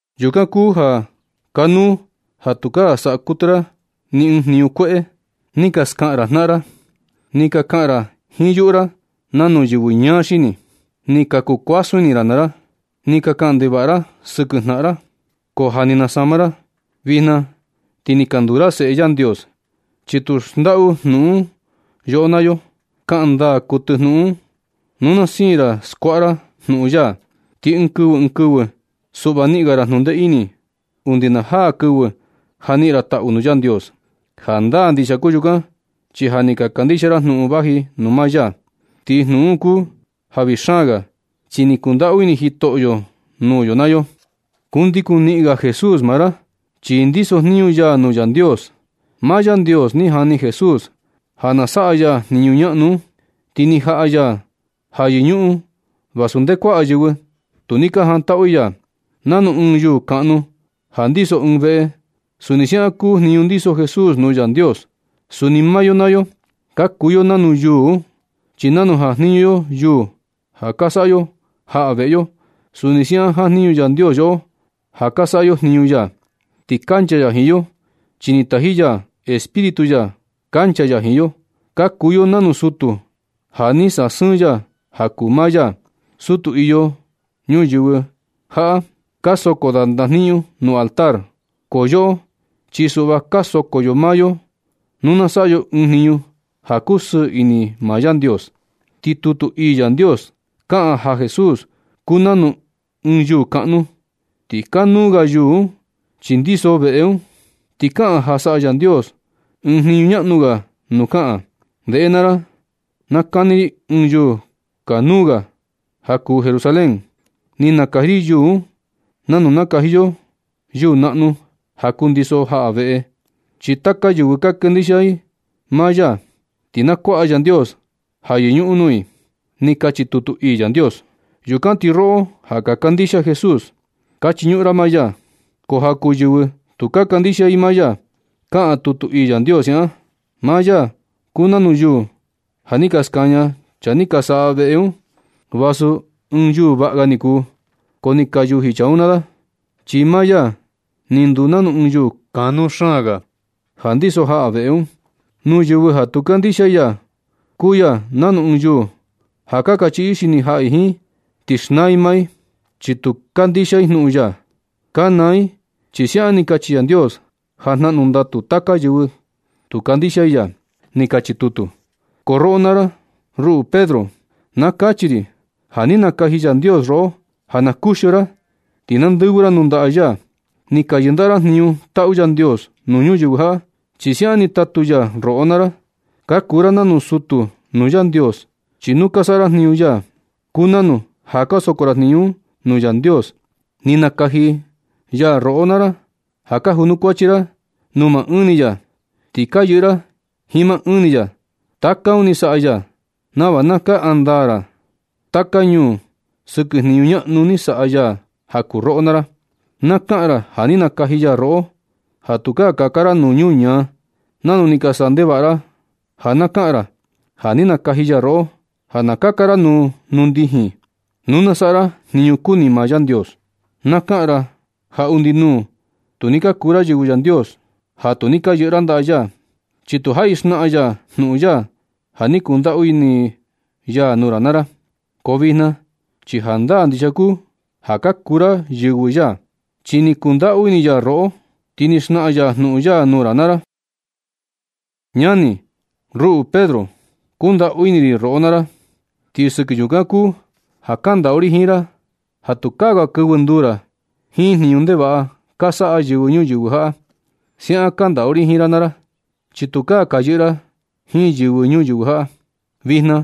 Yukan kuu ja kanuu ja tukaa saꞌa kuɨtɨ ra ni ɨɨn jniñu kueꞌe, ni ka skaꞌan ra jnaꞌan ra, ni ka kaꞌan ra jiin yuꞌu ra nanu yɨvɨ ñaa xini, ni ka kuu kuasun ini ra naa ra, ni ka kaꞌan ndevaꞌa ra sɨkɨ jnaꞌan ra. Ko ja ni ka nasama ra. Vijna ti ni ka nduu ra seꞌe Yandios, chi tu xndaꞌu jnuꞌun un yoꞌo naa yo. Kaꞌan ndaa kuɨtɨ jnuꞌun un. Nu na siin ra skuaꞌa ra jnuꞌun ya, ti ɨɨn kɨvɨ ɨɨn kɨvɨ suꞌva niꞌin ga ra jnundee ini, undi na jaa ɨɨn kɨvɨ ja niꞌin ra taꞌu nuu Yandios. Jandaa ndixia kuu yukan, chi ja ni ka kandixia ra jnuꞌun vaji nuu maa ya. Ti jnuꞌun un kuu ja vii xaan ga, chi ni kundaꞌu ini Jitoꞌo nuu yo naa yo. Kundikun niꞌin ga Jesús naa ra, chi ndisojniñu ya nuu Yandios. Maa Yandios ni jani Jesús ja na saꞌa ya jniñu ñaꞌnu un, ti ni jaꞌa ya ja yɨñuꞌun vasu ndee kuaꞌa yɨvɨ tu ni ka jantaꞌu i ya. Nanu ɨɨn yuu kaꞌnu ja ndiso ɨɨn veꞌe, suni siaꞌan kuu jniñu ndiso Jesús nuu Yandios. Suni maa yo naa yo ka kuu yo nanu yuu un, chi nanu jajniñu yo yuu ja ka saꞌa yo jaꞌa veꞌe yo, suni siaꞌan jajniñu Yandios yoꞌo ja ka saꞌa yo jniñu ya. Ti kancha ya jiin yo, chi ni taji ya Espíritu ya kancha ya jiin yo. Ka kuu yo nanu sutu ja ni sasɨɨn ya ja kuu maa ya. Sutu iyo nuyɨvɨ jaꞌa ka soko da ndajniñu nuu altar, ko yoꞌo chi suꞌva ka soko yo maa yo nu na saꞌa yo ɨɨn jniñu ja kusɨɨ ini maa Yandios. Ti tutu ii Yandios kaꞌan ja Jesús kuu nanu ɨɨn yuu kaꞌnu, ti kanuu ga yuu un chi ndiso veꞌe un. Ti kaꞌan ja saꞌa Yandios ɨɨn jniñu ñaꞌnu ga nuu kaꞌan: Ndeꞌe naa ra. Na kani ri ɨɨn yuu kanuu ga ja kuu Jerusalén. Ni nakaji ri yuu un nanu nakaji yo yuu naꞌnu ja kundiso jaꞌa veꞌe. Chi taka yɨvɨ ka kandixia i maa ya, ti na kuaꞌa Yandios ja yɨñuꞌun nuu i. Ni kachi tutu ii Yandios. Yukan ti roꞌo ja ka kandixia Jesús, ka chiñuꞌun ra maa ya. Ko ja kuu yɨvɨ tu ka kandixia i maa ya, kaꞌan tutu ii Yandios siaꞌan: Maa ya kuu nanu yuu ja ni ka skaña chaa ni ka saꞌa veꞌe un. Vasu ɨɨn yuu vaꞌa ga niku, ko ni ka yuji chaa un naa da, chi maa ya ni nduu nanu ɨɨn yuu kanuu xaan ga ja ndiso jaꞌa veꞌe un. Nuu yɨvɨ ja tu kandixia i ya, kuu ya nanu ɨɨn yuu ja ka kachiꞌi i xini jaꞌa i jiin, ti xnaa i maa i, chi tu kandixia i jnuꞌun ya. Ka naa i chi siaꞌan ni kachi Yandios ja jnaꞌnu ndatu taka yɨvɨ tu kandixia i ya. Ni kachi tutu. Ko roꞌo naa ra, ruꞌu Pedro, na kachi ri ja ni nakaji Yandios roꞌo ja na kuxio ra, ti na ndɨvɨ ra nuu ndaꞌa ya. Ni ka yɨndaꞌa ra jniñu taꞌu Yandios nuu ñuyɨvɨ jaꞌa, chi siaꞌan ni tatu ya roꞌo naa ra. Ka kuu ra nanu sutu nuu Yandios, chi nu ka saꞌa ra jniñu ya, kuu nanu ja ka soko ra jniñu un nuu Yandios. Ni nakaji ya roꞌo naa ra ja na kunukuachi ra nuu maa ɨɨn ni ya. Ti ka yɨꞌɨ ra jiin maa ɨɨn ni ya. Taka un ni saꞌa ya nava na kaꞌan ndaa ra taka ñuu sɨkɨ jniñu ñaꞌnu ni saꞌa ya ja kuu roꞌo naa ra. Na kaꞌan ra ja ni nakaji ya roꞌo, ja tukaa kaka ra nuu nuñaa nanu ni ka saꞌa ndevaꞌa ra. Ja na kaꞌan ra ja ni nakaji ya roꞌo, ja na kaka ra nuu ndijin, nuu na saꞌa ra jniñu kuni maa Yandios. Na kaꞌan ra ja undi nuu tu ni ka kuu ra yɨvɨ Yandios ja tu ni ka yɨꞌɨ ra ndaꞌa ya, chi tu jaꞌi xnaꞌan ya jnuꞌun ya ja ni kundaꞌu ini ya nuu ra naa ra. Ko vijna chi jandaa ndixia kuu ja ka kuu ra yɨvɨ ya, chi ni kundaꞌu ini ya roꞌo, ti ni xnaꞌan ya jnuꞌun ya nuu ra naa ra. Ñani, ruꞌu Pedro, kundaꞌu ini ri roꞌo naa ra, ti sɨkɨ yukan kuu ja kandaꞌu ri jiin ra ja tukaa ga kɨvɨ nduu ra jiin jniñu ndevaꞌa ja ka saꞌa yɨvɨ ñuyɨvɨ jaꞌa. Siaꞌan kandaꞌu ri jiin ra naa ra, chi tukaa ka yɨꞌɨ ra jiin yɨvɨ ñuyɨvɨ jaꞌa. Vijna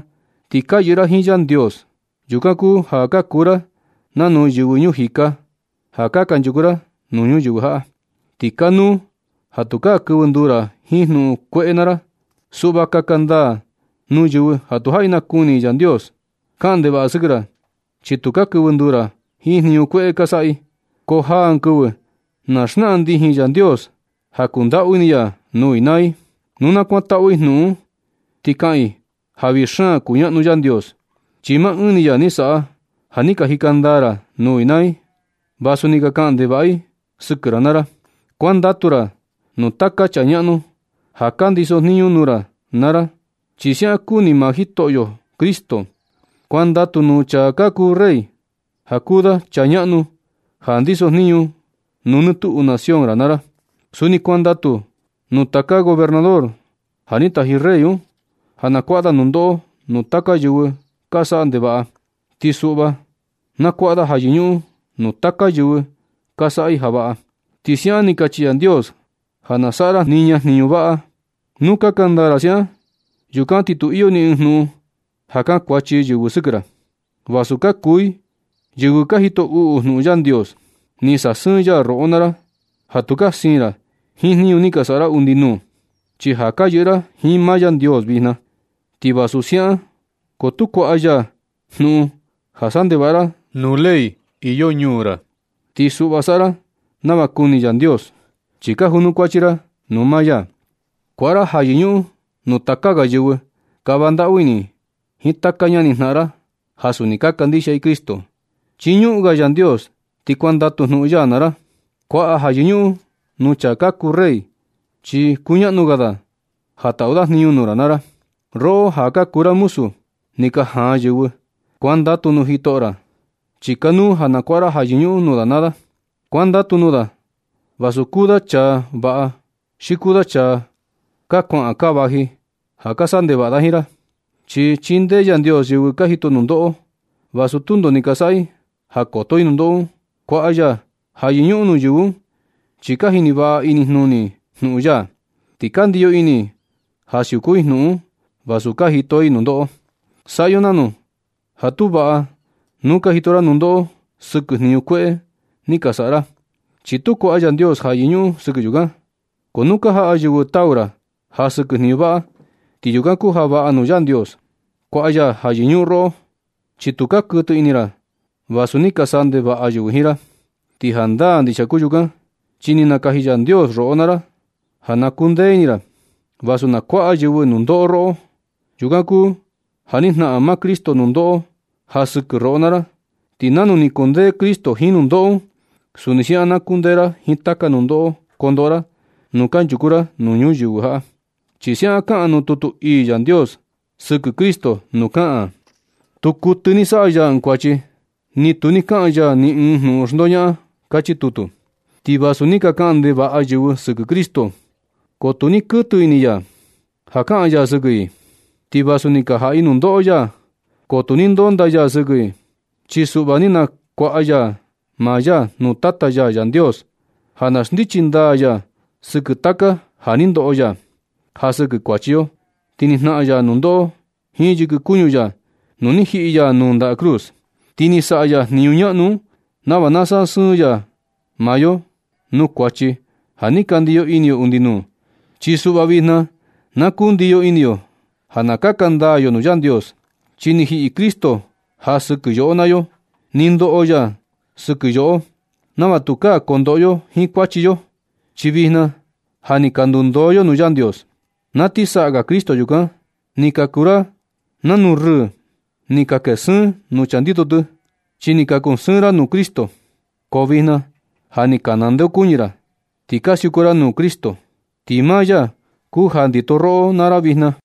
ti ja ka yɨꞌɨ ra jiin Yandios. Yukan kuu ja ka kuu ra nanu yɨvɨ ñuu jika ja kanchuku ra nuu ñuyɨvɨ jaꞌa, ti kanuu ja tukaa kɨvɨ nduu ra jiin jnuꞌun kueꞌe naa ra. Suꞌva kaka ndaa nuu yɨvɨ ja tu jaꞌi nakuni i Yandios. Kaꞌan ndevaꞌa sɨkɨ ra, chi tu ka kɨvɨ nduu ra jiin jniñu kueꞌe ka saꞌa i. Ko jaa ɨɨn kɨvɨ na xnaꞌan ndijin Yandios ja kundaꞌu ini ya nuu i naa i. Nu na kuantaꞌu i jnuꞌun un, ti kaꞌan i ja vii xaan kuñaꞌnu Yandios, chi maa ɨɨn ni ya ni saꞌa ja ni ka jika ndaa ra nuu i naa i, vasu ni ka kaꞌan ndevaꞌa i sɨkɨ ra naa ra. Kuandatu ra nuu taka chaa ñaꞌnu ja ka ndisojniñu nuu ra naa ra, chi siaꞌan kuni maa Jitoꞌo Cristo. Kuandatu nuu chaa kuu rey, ja kuu da chaa ñaꞌnu ja ndisojniñu nuu nɨ tuꞌu nación ra naa ra. Suni kuandatu nuu taka gobernador ja ni taji rey un, ja na kuaꞌa da nundoꞌo nuu taka yɨvɨ ka saꞌa ndevaꞌa. Ti suꞌva na kuaꞌa da ja yɨñuꞌun nuu taka yɨvɨ ka saꞌa i ja vaꞌa. Ti siaꞌan ni kachi Yandios ja na saꞌa ra niña jniñu vaꞌa. Nu kaka ndaa ra siaꞌan, yukan ti tu iyo ni ɨɨn jnuꞌun ja kankuachi yɨvɨ sɨkɨ ra, vasu ka kuu i yɨvɨ ka jito uꞌu jnuꞌun Yandios. Ni sasɨɨn ya roꞌo naa ra ja tukaa siin ra jiin jniñu ni ka saꞌa ra undi nuu, chi ja ka yɨꞌɨ ra jiin maa Yandios vijna. Ti vasu siaꞌan, ko tu kuaꞌa ya jnuꞌun ja saꞌa ndevaꞌa ra nuu ley iyo ñuu ra. Ti suꞌva saꞌa ra nava kuni Yandios, chi ka junukuachi ra nuu maa ya. Kuaꞌa ra ja yɨñuꞌun nuu taka ga yɨvɨ. Kava ndaꞌu ini jiin taka ñani jnaꞌan ra ja suni ka kandixia i Cristo. Chiñuꞌun ga Yandios ti kuandatu jnuꞌun ya naa ra. Kuaꞌa ja yɨñuꞌun nuu chaa kuu rey, chi kuñaꞌnu ga da ja taꞌu da jniñu nuu ra naa ra. Roꞌo ja ka kuu ra muzu ni ka jaan yɨvɨ, kuandatu nuu jitoꞌo ra, chi kanuu ja na kuaꞌa ra ja yɨñuꞌun nuu da naa da. Kuandatu nuu da vasu kuu da chaa vaꞌa xi kuu da chaa kaa kuaꞌan kaa vaji ja ka saꞌa ndevaꞌa da jiin ra. Chi chindee Yandios yɨvɨ ka jito nundoꞌo, vasu tundo ni ka saꞌa i ja koto i nundoꞌo un. Kuaꞌa ya ja yɨñuꞌun nuu yɨvɨ un, chi ka jini vaꞌa inijnuni i jnuꞌun ya, ti ka ndiyo ini i ja siuku i jnuꞌun un, vasu ka jito i nundoꞌo. Saꞌa yo nanu ja tu vaꞌa nu ka jito ra nundoꞌo sɨkɨ jniñu kueꞌe ni ka saꞌa ra. Chi tu kuaꞌa Yandios ja yɨñuꞌun sɨkɨ yukan. Ko nu ka jaꞌa yɨvɨ tau ra ja sɨkɨ jniñu vaꞌa, ti yukan kuu ja vaꞌa nuu Yandios. Kuaꞌa ya ja yɨñuꞌun roꞌo, chi tu ka kuɨtɨ ini ra vasu ni ka saꞌa ndevaꞌa yɨvɨ jiin ra. Ti jandaa ndixia kuu yukan, chi ni nakaji Yandios roꞌo naa ra ja na kundee ini ra, vasu na kuaꞌa yɨvɨ nundoꞌo roꞌo. Yukan kuu ja ni jnaꞌan maa Cristo nundoꞌo ja sɨkɨ roꞌo naa ra. Ti nanu ni kundee Cristo jiin nundoꞌo un, suni siaꞌan na kundee ra jiin taka nundoꞌo kondoꞌo ra nu kanchuku ra nuu ñuyɨvɨ jaꞌa. Chi siaꞌan kaꞌan nuu tutu ii Yandios sɨkɨ Cristo nuu kaꞌan: Tu kuɨtɨ ni saꞌa ya ɨɨn kuachi, ni tu ni kaꞌan ya ni ɨɨn jnuꞌun xndoñaꞌan. Kachi tutu. Ti vasu ni ka kaꞌan ndevaꞌa yɨvɨ sɨkɨ Cristo, ko tu ni kuɨtɨ ini ya, ja kaꞌan ya sɨkɨ i. Ti vasu ni ka jaꞌa i nundoꞌo ya, ko tu ni ndondaa ya sɨkɨ i. Chi suꞌva ni nakuaꞌa ya maa ya nuu Tata ya Yandios ja na xndichi ndaa ya sɨkɨ taka ja ni ndoꞌo ya. Ja sɨkɨ kuachi yo, ti ni jnaꞌan ya nundoꞌo jiin yɨkɨ kuñu ya nu ni jiꞌi ya nuu ndaꞌa cruz. Ti ni saꞌa ya jniñu ñaꞌnu un nava na sasɨɨn ya maa yo nuu kuachi ja ni ka ndiyo ini yo undi nuu. Chi suꞌva vijna na kundiyo ini yo ja na kaka ndaa yo nuu Yandios, chi ni jiꞌi Cristo ja sɨkɨ yoꞌo naa yo. Ni ndoꞌo ya ja sɨkɨ yoꞌo nava tukaa kondoꞌo yo jiin kuachi yo, chi vijna ja ni ka ndundoo yo nuu Yandios. Na ti saꞌa ga Cristo yukan, ni ka kuu ra nanu rɨɨ ja ni ka kee sɨɨn nuu chaa ndito tɨ, chi ni ka kuu sɨɨn ra nuu Cristo. Ko vijna ja ni ka ndeokuñɨ ra, ti ka siuku ra nuu Cristo. Ti maa ya kuu ja ndito roꞌo naa ra vijna.